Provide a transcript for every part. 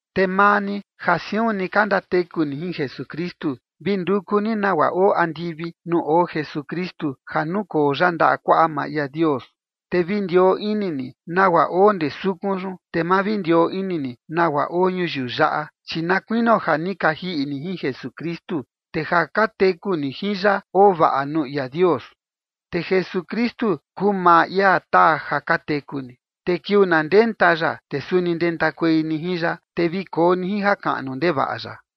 Te maa ni ja siun ni ka ndateku ni jin Jesukristu, vi nduku ni nagua oo andivi nuu oo Jesukristu ja nukoo ya ndaꞌa kuaꞌa maa ia Dios. Te vi ndioo ini ni nagua oo ndee sukun yun, te ma vi ndioo ini ni nagua oo ñuyiu yaꞌa. Chi na kuinio ja ni ka jiꞌi ni jin Jesukristu, te ja ka teku ni jin ya oo vaꞌa nuu ia Dios. Te Jesukristu kuu maa ia taa ja ka teku ni, te kiuu na ndenta ya, te suni ndentakuei ni jin ya, te vi koo ni jin jakaꞌnu ndevaꞌa ya.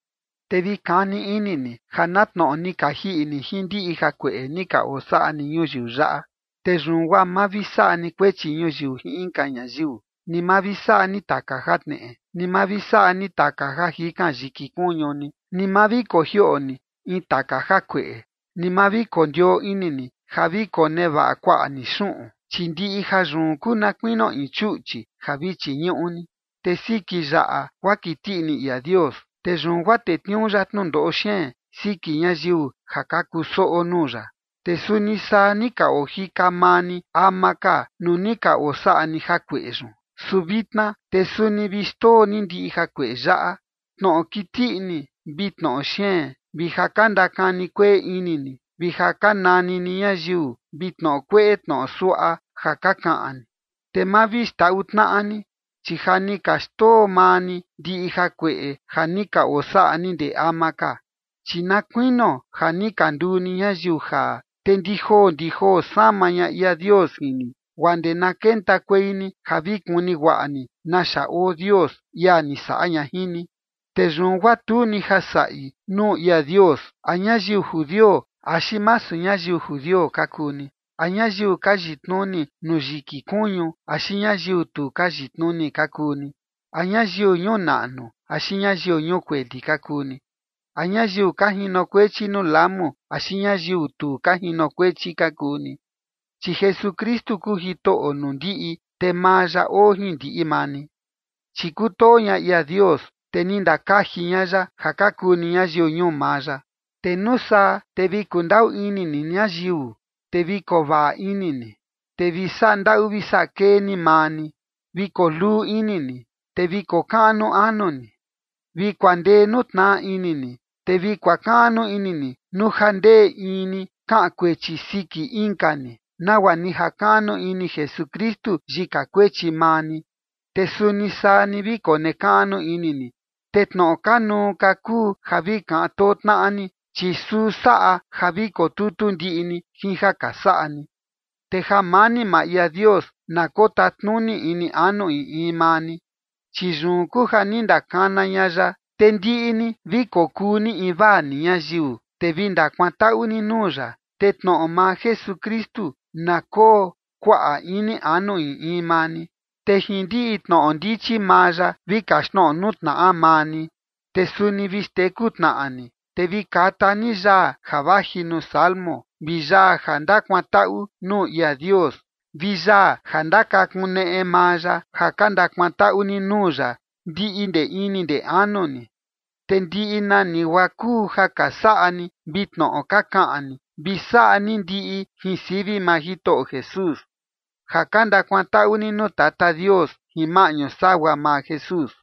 Te vi kani ini ni ja na tnoꞌo ni ka jiꞌi ni jin ndiꞌi jakueꞌe ni ka osaꞌa ni ñuyiu yaꞌa. Te yun guaa ma vi saꞌa ni kuechi ñuyiu jin inka ñayiu, ni ma vi saꞌa ni taka jatneꞌe, ni ma vi saꞌa ni taka ja jikan yiki kuñu ni, ni ma vi kojioꞌo ni in taka jakueꞌe, ni ma vi kondioo ini ni ja vi konevaꞌa kuaꞌa ni xuꞌun, chi ndiꞌi jayun kuu na kuinio in chuꞌchi ja vi chiñuꞌu ni. Te siki yaꞌa guaa kiti ini ia Dios, te yun guaa tetniuu ya tnundoꞌo xeen siki ñayiu ja ka kusoꞌo nuu ya. Te suni saa ni ka ojika maa ni ama ka nuu ni ka osaꞌa ni jakueꞌe yun. Su vitna te suni vi xndoo ni ndiꞌi jakueꞌe yaꞌa: Tnoꞌo kiti ini vi tnoꞌo xeen vi ja ka ndakani kueꞌe ini ni, vi ja ka nani ni ñayiu, vi tnoꞌo kueꞌe tnoꞌo suaꞌa ja ka kaꞌan ni. Te ma vi xndaꞌu tnaꞌa ni, chi ja ni ka xndoo maa ni ndiꞌi jakueꞌe ja ni ka osaꞌa ni ndee ama ka. Chi na kuinio ja ni ka nduu ni ñayiu jaa, te ndi joo ndi joo sama ña ia Dios jin ni guaa ndee na kentakuei ni ja vi kuni guaꞌa ni naxa oo Dios, ia ni saꞌa ña jin ni. Te yun guaa tu ni ja saꞌi nuu ia Dios a ñayiu judio axi masu ñayiu judio ka kuu ni, a ñayiu ka yitnuni nuu yiki kuñu axi ñayiu tu ka yitnuni ka kuu ni, a ñayiu ñuu naꞌnu axi ñayiu ñuu kueli ka kuu ni, a ñayiu ka jinokuechi nuu lamu axi ñayiu tu ka jinokuechi ka kuu ni. Chi Jesukristu kuu Jitoꞌo nuu ndiꞌi, te maa ya oo jin ndiꞌi maa ni. Chi kutoo ña ia Dios, te ni ndakaji ña ya ja ka kuu ni ñayiu ñuu maa ya. Te nuu saa te vi kundaꞌu ini ni ñayiu, te vi kovaꞌa ini ni, te vi saꞌa ndaꞌu vi saꞌa kee ni maa ni, vi koo luu ini ni, te vi kokaꞌnu anu ni, vi kuandee nuu tnaꞌa ini ni, te vi kuakaꞌnu ini ni nuu ja ndee in ni kaꞌan kuechi siki inka ni, nagua ni jakaꞌnu ini Jesukristu yika kuechi maa ni, te suni saa ni vi konekaꞌnu ini ni. Te tnoꞌo kanuu ka kuu ja vi kaꞌan too tnaꞌa ni, chi suu saꞌa ja vi kotutu ndiꞌi ni jin ja ka saꞌa ni. Te jamani maa ia Dios na kotatnuni ini anu in in maa ni, chi yun kuu ja ni ndakana ña ya, te ndiꞌi ni vi kokuu ni invaa ni ñayiu, te vi ndakuantaꞌu ni nuu ya. Te tnoꞌo maa Jesukristu na koo kuaꞌa ini anu in in maa ni, te jin ndiꞌi tnoꞌo ndichi maa ya vi kaxtnoꞌo nuu tnaꞌa maa ni, te suni vi xteku tnaꞌa ni. Te vi kata ni yaa ja vaji nuu salmo vi yaa ja ndakuantaꞌu nuu ia Dios vi yaa ja ndakakuneꞌe maa ya, ja ka ndakuantaꞌu ni nuu ya ndiꞌi ndee ini ndee anu ni. Te ndiꞌi nani guaa kuu ja ka saꞌa ni vi tnoꞌo ka kaꞌan ni, vi saꞌa ni ndiꞌi jin sivi maa Jitoꞌo Jesús, ja ka ndakuantaꞌu ni nuu Tata Dios jin maꞌñu sagua maa Jesús.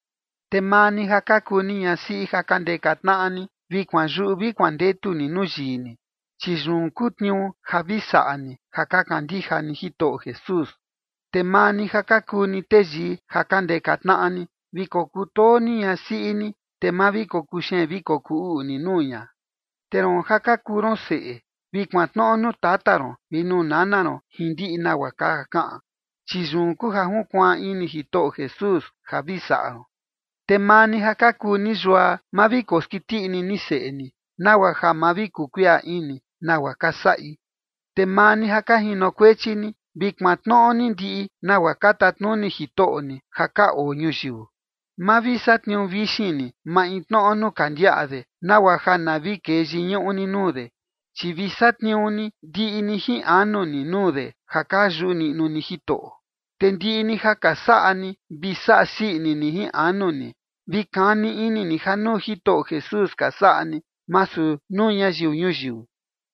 Te maa ni ja ka kuu ni ñasiꞌi ja ka ndeka tnaꞌa ni, vi kuanyuꞌu vi kuandetu ni nuu yii ni, chi yun kuu tniuu ja vi saꞌa ni, ja ka kandija ni Jitoꞌo Jesús. Te maa ni ja ka kuu ni teyii ja ka ndeka tnaꞌa ni, vi kokutoo ni ñasiꞌi ni, te ma vi kokuxeen vi kokuu uꞌu ni nuu ña. Te roon ja ka kuu ron seꞌe, vi kuantnoꞌo nuu tata ron vi nuu nana ron jin ndiꞌi nagua ka kaꞌan, chi yun kuu ja junkuaan ini Jitoꞌo Jesús ja vi saꞌa ron. Te maa ni ja ka kuu ni yua, ma vi koskiti ini ni seꞌe ni, nagua ja ma vi kuu kuiꞌa ini nagua ka saꞌi. Te maa ni ja ka jinokuechi ni, vi kuantnoꞌo ni ndiꞌi nagua ka tatnuni jitoꞌo ni ja ka oo ñuyiu. Ma vi satniuu vixin ni maintnoꞌo nuu ka ndiaꞌa de, nagua ja na vi kee yiñuꞌu ni nuu de, chi vi satniuu ni ndiꞌi ni jin anu ni nuu de ja ka yuꞌu niꞌnu ni Jitoꞌo. Te ndiꞌi ni ja ka saꞌa ni, vi saꞌa sii ini ni jin anu ni, vi kani ini ni ja nuu Jitoꞌo Jesús ka saꞌa ni, masu nuu ñayiu ñuyiu.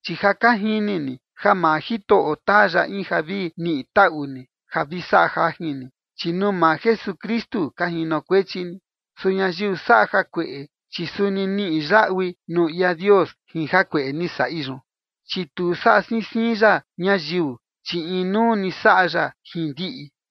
Chi ja ka jini ni ja maa Jitoꞌo taa ya in ja vi niꞌi taꞌu ni ja vi saꞌa jajin ni, chi nuu maa Jesukristu ka jinokuechi ni. Su ñayiu saꞌa jakueꞌe, chi suni niꞌi yaꞌui nuu ia Dios jin jakueꞌe ni saꞌi yun, chi tu saꞌa siin siin ya ñayiu, chi inuu ni saꞌa ya jin ndiꞌi.